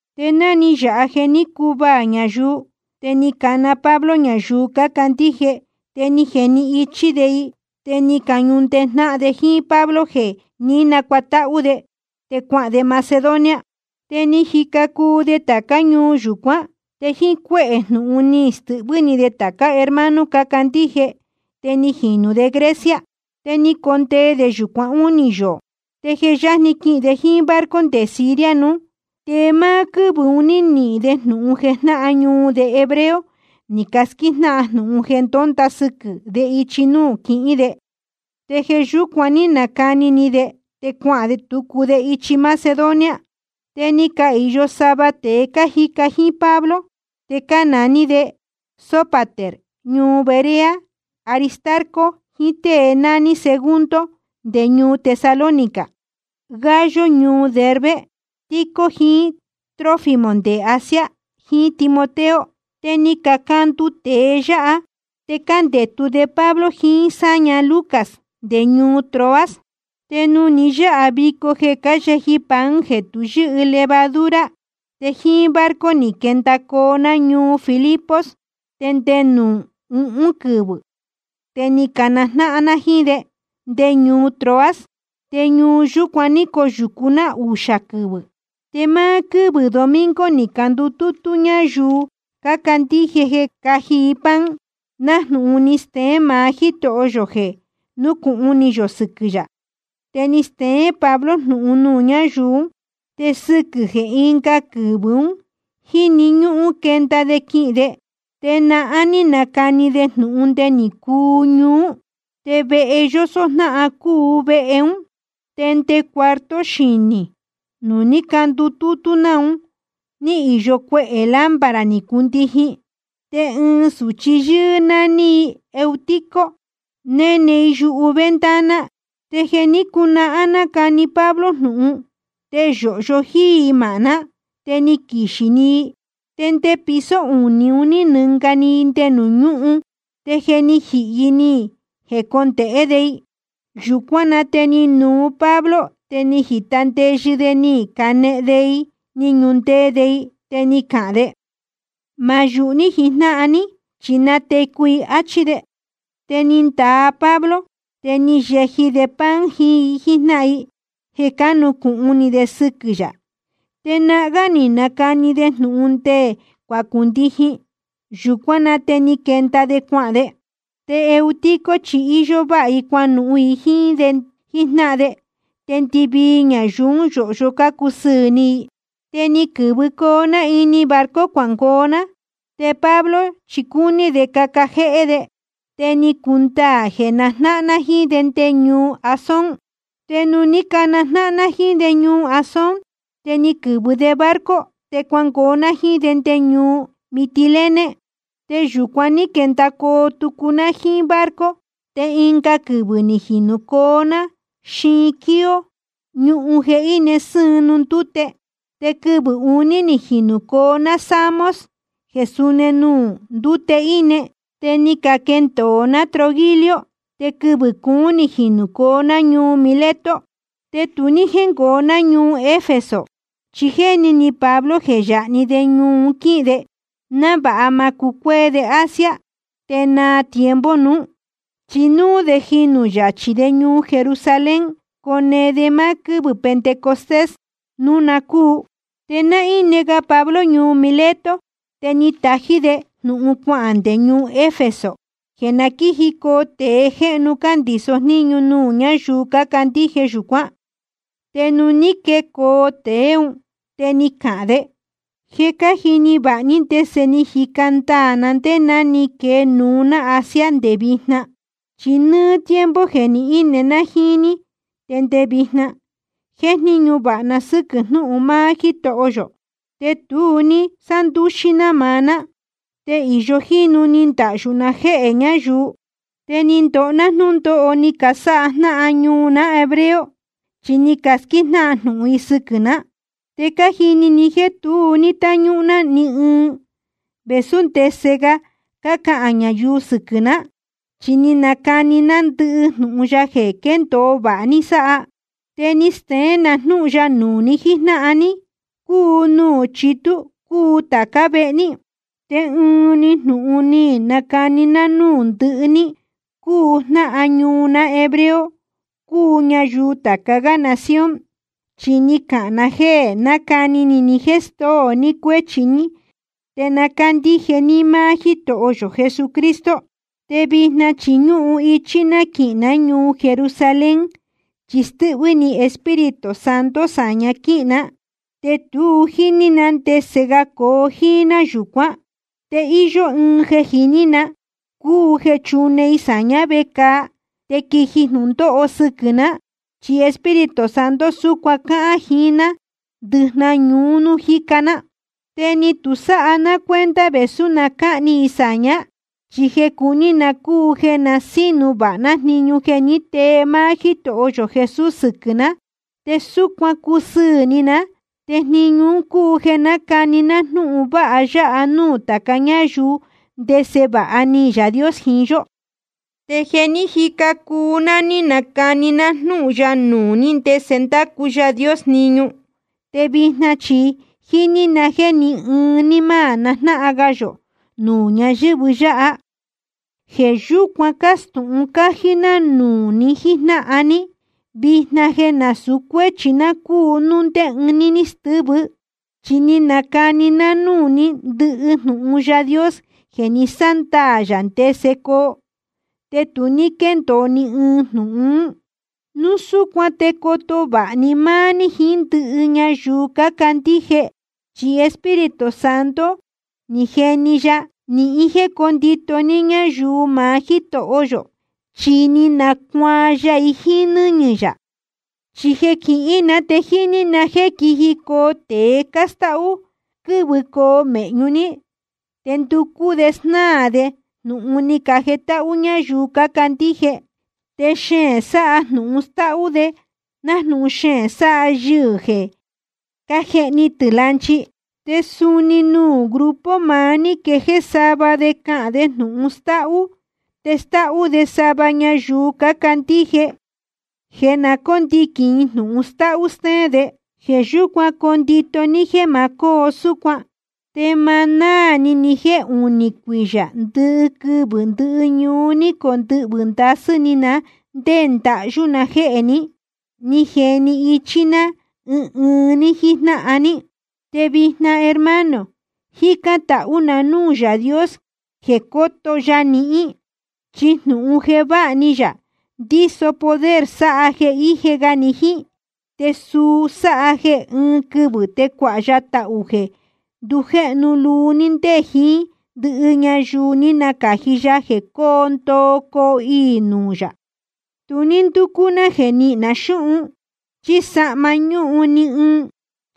Te ná ni yāha jéē ní cacuvaā ñayuu, te ni cana Pablo ñayuu cácandíje, te ni jeni ichí de i. Te ni cañunundee jnáhan de jíín Pablo jeē ní nacuatáhú de, te cuahān de Macedonia. Te ni jica cuu de tācá ñuu yúcuan. Te jíín cuéhē jnūhun ni stɨhvɨ́ ni de tācá hermano cácandíje. Te ni jinū de Grecia. Te ni condee de yūcuan únī yoō. Te je yajni quihīn de jíín barco nde Siria nuú, te máá quɨ́vɨ̄ ún te ni nihīn de jnūhun jeē jnáhan ñuu de hebreo ni casquíjnáhan jnūhun jeē ndonda sɨquɨ̄ de ichi nuū quihín de, te jeē yúcuan ní nacani ni de te cuahān tucu de ichi Macedonia. Te ni cahīyo sava tēe cájica jíín Pablo, te cánaní de Sópater ñuu Berea, Aristarco jiín tée nání Segundo nde ñuu Tesalónica, Gayo ñuu Derbe, Tíquico jiín Trófimo nde Asia, jiín Timoteo. Te ni cacandu tēe yáha, te cándētu de Pablo jiín sáña, Lucas, nde ñuu Troas. Te nuū ni yáha vico jeē cáyeji i pan jeē tu yɨ́hɨ levadura, te jíín barco ni quendacoo ná ñuu Filipos, te nde nuū uhún quɨvɨ̄ te ni canajnáhan ná jíín de nde ñuu Troas. Te ñuu yúcuan ní coyūcu ná uxā quɨvɨ̄. Te máá quɨ́vɨ̄ domingo ni candutútú ñáyuu cácandíje jeē cáji i pan, nájnūhun ni steén maá Jítoho yō jeē núcūhun ni yō sɨquɨ̄ yā. Te ni steén Pablo jnūhun nuū ñáyuu ún. Te sɨquɨ̄ jeē ɨnga quɨvɨ̄ un jíni ñúhún quenda de quihīn de, te nahán ní nacani de jnūhun nde ni cuñuú. Te vehe yósó jnáhan cúu vehe ún. Te nde cuarto xinī nuū ní candutútú ná un ní īyo cuehē lámpara ni cundijin. Te ɨɨn sūchi yɨ́ɨ́ nání i Eutico, néne i yuhu ventana. Te jeē ní cunahán nácani Pablo jnūhun, te yōhyo jíí i māhná, te ni quixī‑ni i. Te nde piso unī un ní nɨnga i nde nuū ñúhun. Te je ni jihī i ni candonehen de i. Yūcuán na te ni nuu Pablo te ni jita ndeyɨ de ni canehen de i ni ñunundee de i, te ni cahān de: Ma yūhu ní jíjnáhan ní, chi ni natecu i, áchí de. Te ni ndaa Pablo, te ni yeji de pan jiín i jíjnáhan i jeē cánucūhun ni de sɨquɨ̄ yā. Te nahán gá ni nacani de jnūhun nde cuacundijin. Yūcuán na te ni quenda de cuahān de. Te Eutico chi íyó váha i cuanuhun i jíín de jíjnáhan de, te ndɨvii ñayuu ún yōhyo cácusɨɨ̄ ni i. Te ni quɨ̄vɨcoo ná ini barco cuangoo ná. Te Pablo chi cúní de caca jéhé de, te ni cundaā jeē najnáhan ná jíín de nde ñuu Asón. Te nuū ní canajnáhan ná jíín de ñuu Asón, te ni quɨ̄vɨ de barco te cuangoo ná jíín de nde ñuu Mitilene. Te yūcuan ní quendacoo tucu ná jíín barco te ɨnga quɨvɨ̄ ni jinūcoo ná xiin Quío, ñuhun jeē íne sɨ́ɨn nuū ndúte. Te quɨvɨ̄ uní ni jinūcoo ná Samos jeē súni nuū ndúte íne, te ni caquendōo ná Trogilio. Te quɨvɨ̄ cuún ni jinūcoo ná ñuu Mileto. Te tu ní jéngoo ná ñuu Efeso, chi jéni ni Pablo jeē yáha‑ni de ñuu un quíhīn de, návāha ma cucuéé de Asia te naa tiempo nuú, chi núú de jinū yachī de ñuu Jerusalén cone de máá quɨ́vɨ̄ Pentecostés núu na cúu. Te ná íne ga Pablo ñuu Mileto, te ni tají de jnūhun cuahān nde ñuu Efeso jeē na quíjicoo tēe jéhnu cándīso jníñu nuū ñáyuu cácandíje yūcuán. Te nuū ní quecoo tēe ún, te ni cahān de: Je cájini vāha ní ndese ni jica ndaā na ndé ná ni quee nuú ná Asia te nde vijna. Chi nɨ́ɨ́ tiempo jeē ni íne ná jíín ní te nde vijna, jéjníñu vāha na sɨ́quɨ̄ jnúhun máá Jítoho yō, te tu ní sándúxí ná maá ná. Te íyó jínu ni ndahyū na jéhē ñáyuu. Te ni ndoho ná jnúndóho ni casáha jnáhan ñuu ná hebreo, chi ni casquíjnáhan jnūhun i sɨquɨ̄ ná. Te cájini ni jéē tu ní táñúhún ná ni ɨɨn, vēsú ndese ga cácahān ñayuu sɨquɨ̄ ná, chi ni nacani ná ndɨhɨ jnūhun ya jeē quéndōo vāha ní sáha. Te ni steén na jnúhun ya nuū ni jíjnáhan ní, cúu nuū chitú cúu tācá vehe ní. Te ɨnuú‑ni jnūhun ni nacani ná núū ndɨhɨ ní, cúu jnáhan ñuu ná hebreo cúu ñayuu tāca gá nación, chi ni cahān na jéē na nácani ni ni jéē stóo ni cuéchi ní te na cándíje ní máá Jítoho yō Jesucristo. Te vijna chi ñúhun ichí ná quihīn ná ñuu Jerusalén, chi stɨ́hvɨ́ ni Espíritu Santo sāña quíhīn ná. Te tu jíní ná ndese ga coo jíín ná yūcuán. Te íyó ɨɨn jeē jiní na, cúu jeē chune i sāñá vecāa te quiji jnūndóho sɨquɨ̄ ná, chi Espíritu Santo súcuan cáhán jiín ná ndɨjnahan ñuu nuū jíca ná. Te ni tu sáha ná cuenta vēsú na cáhni i sāñá, chi jeē cuní na cúu jeē na sínu vāha ná jniñu jeē ní tee máá Jítoho yō Jesús sɨquɨ̄ ná, te súcuan cusɨɨ̄ ni ná. Te jniñu un cúu jeē nácani ná jnúhun vāha ya nuū tāca ñáyuu ndese vāha ni Yaā Dios jiín yó. ’Te je ni jica cuu ná, ní nacani ná jnúhun ya nuū ní ndese ndácu Yaā Dios jniñu. Te vijna chi jíní na jéē ni ɨɨn ní ma najnáhan ga yō nuū ñáyɨ̄vɨ yáha. Jeē yúcuan cástūhun cájí ná nuū ni jíjnáhan ní vijna jeē násūu cuéchi ná cúu núu ndé ɨɨn ní stɨ́vɨ. Chi ni nacani ná núū ní ndɨhɨ jnūhun Yaā Dios jeē ni sándaā yā ndese coo, te tu ní quéndōo ni ɨɨn jnūhun. Núu súcuan te coto vāha ní máá ní jiín ndɨhɨ ñayuu cácandíje, chi Espíritu Santo ni jeni ya nihín jéē cóndito ní ñáyuu maá Jítoho yō, chi ni nacuaan ya i jíín nɨ́ñɨ̄ yā. Chi jeē quihín na te jíní na jéē quijicoo tēe cástáhú quɨ́vɨcoo mēhñu ní, te nducú de snáā de jnūhun ni cajetáhú ñáyuu cácandíje, te xeēn sáha jnūhun stáhú de nájnūhun xeēn sáha yɨhɨ̄ jeē cájehni tɨ̄ lanchi. Te suni nuū grupo maá ní quejéé sava de cahān de jnūhun stáhú, te stáhú de sava ñayuu cácandíje jeē na cóndiquīn i jnūhun stáhú stéén de. Jeē yúcuan condito ní jéē ma cóo súcuan. Te ma náā ni ni jéē uní cuiyā ndɨquɨvɨ̄ ndɨ́ñuu ni condɨhvɨ̄ ndasɨ́ ni na ndé ndahyú na jéhē ni, ní jeni ichí ná ɨɨn ɨɨn ní jíjnáhan ní. ’Te vijna, hermano, jícán tahú na núū Yaā Dios jeē coto ya nihín. Chi jnūhun jeē váha ni yā ndíso poder sáha jeē íje ga ni jíín, te suu sáha jeē ɨɨn quɨvɨ̄ te cuāha ya tahū jeē ndujéhnu luu ní ndé jiín ndɨhɨ ñayuu ní nacāji ya jeē cóo ndoo coo iī i nuū yā. Tu ní ndúcú ná jeē nihín na xúhun chí sahma nuū ní ɨɨn i.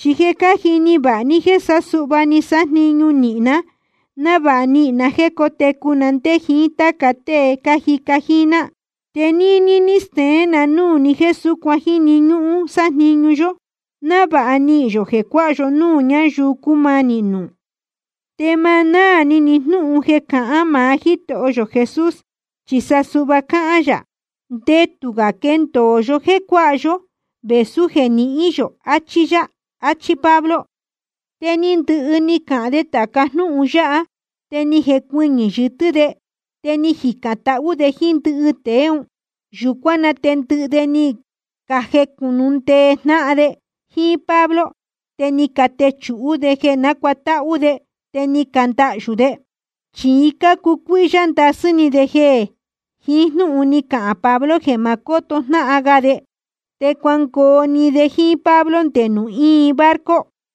Chi je cájini vāha ni jéē sa suhva ni sájniñu nīhin ná návāha nihīn na jéē cótecu na ndé jiín táca tée cájica jíín ná. Te níní ní steén na núū ni jéē súcuan jíni ñúhún sájniñu yó návāha nihīn yō jeē cuáha yó núū ñayuu cúmanī nuū. Te ma náā ni ni jnúhun jeē ni cáhān maá Jítoho yō Jesús, chi suhva ni cahān yā: Ndetū gā quendōo yó jéē cuáha yó vēsú jeē nihín yō, achí yá. Achí Pablo. Te ni ndɨhɨ ni cahān de tāca jnúhun yáha, te ni jecuɨñɨ̄ yɨtɨ́ de, te ni jicān tahú de jíín ndɨhɨ tēe ún. Yūcuán na te ndɨhɨ de ni cajecunundee jnáhan de jíín Pablo ni catechūhú de jeē cánacuatáhú de, te ni candahyū de. Chi cácucuíhyá ndasɨ́ ni de jíín jnúhun ni cahān Pablo jeē ma ndácoto jnáhan ga de. Te cuangoo‑ni de jíín Pablo nde núū íin barco.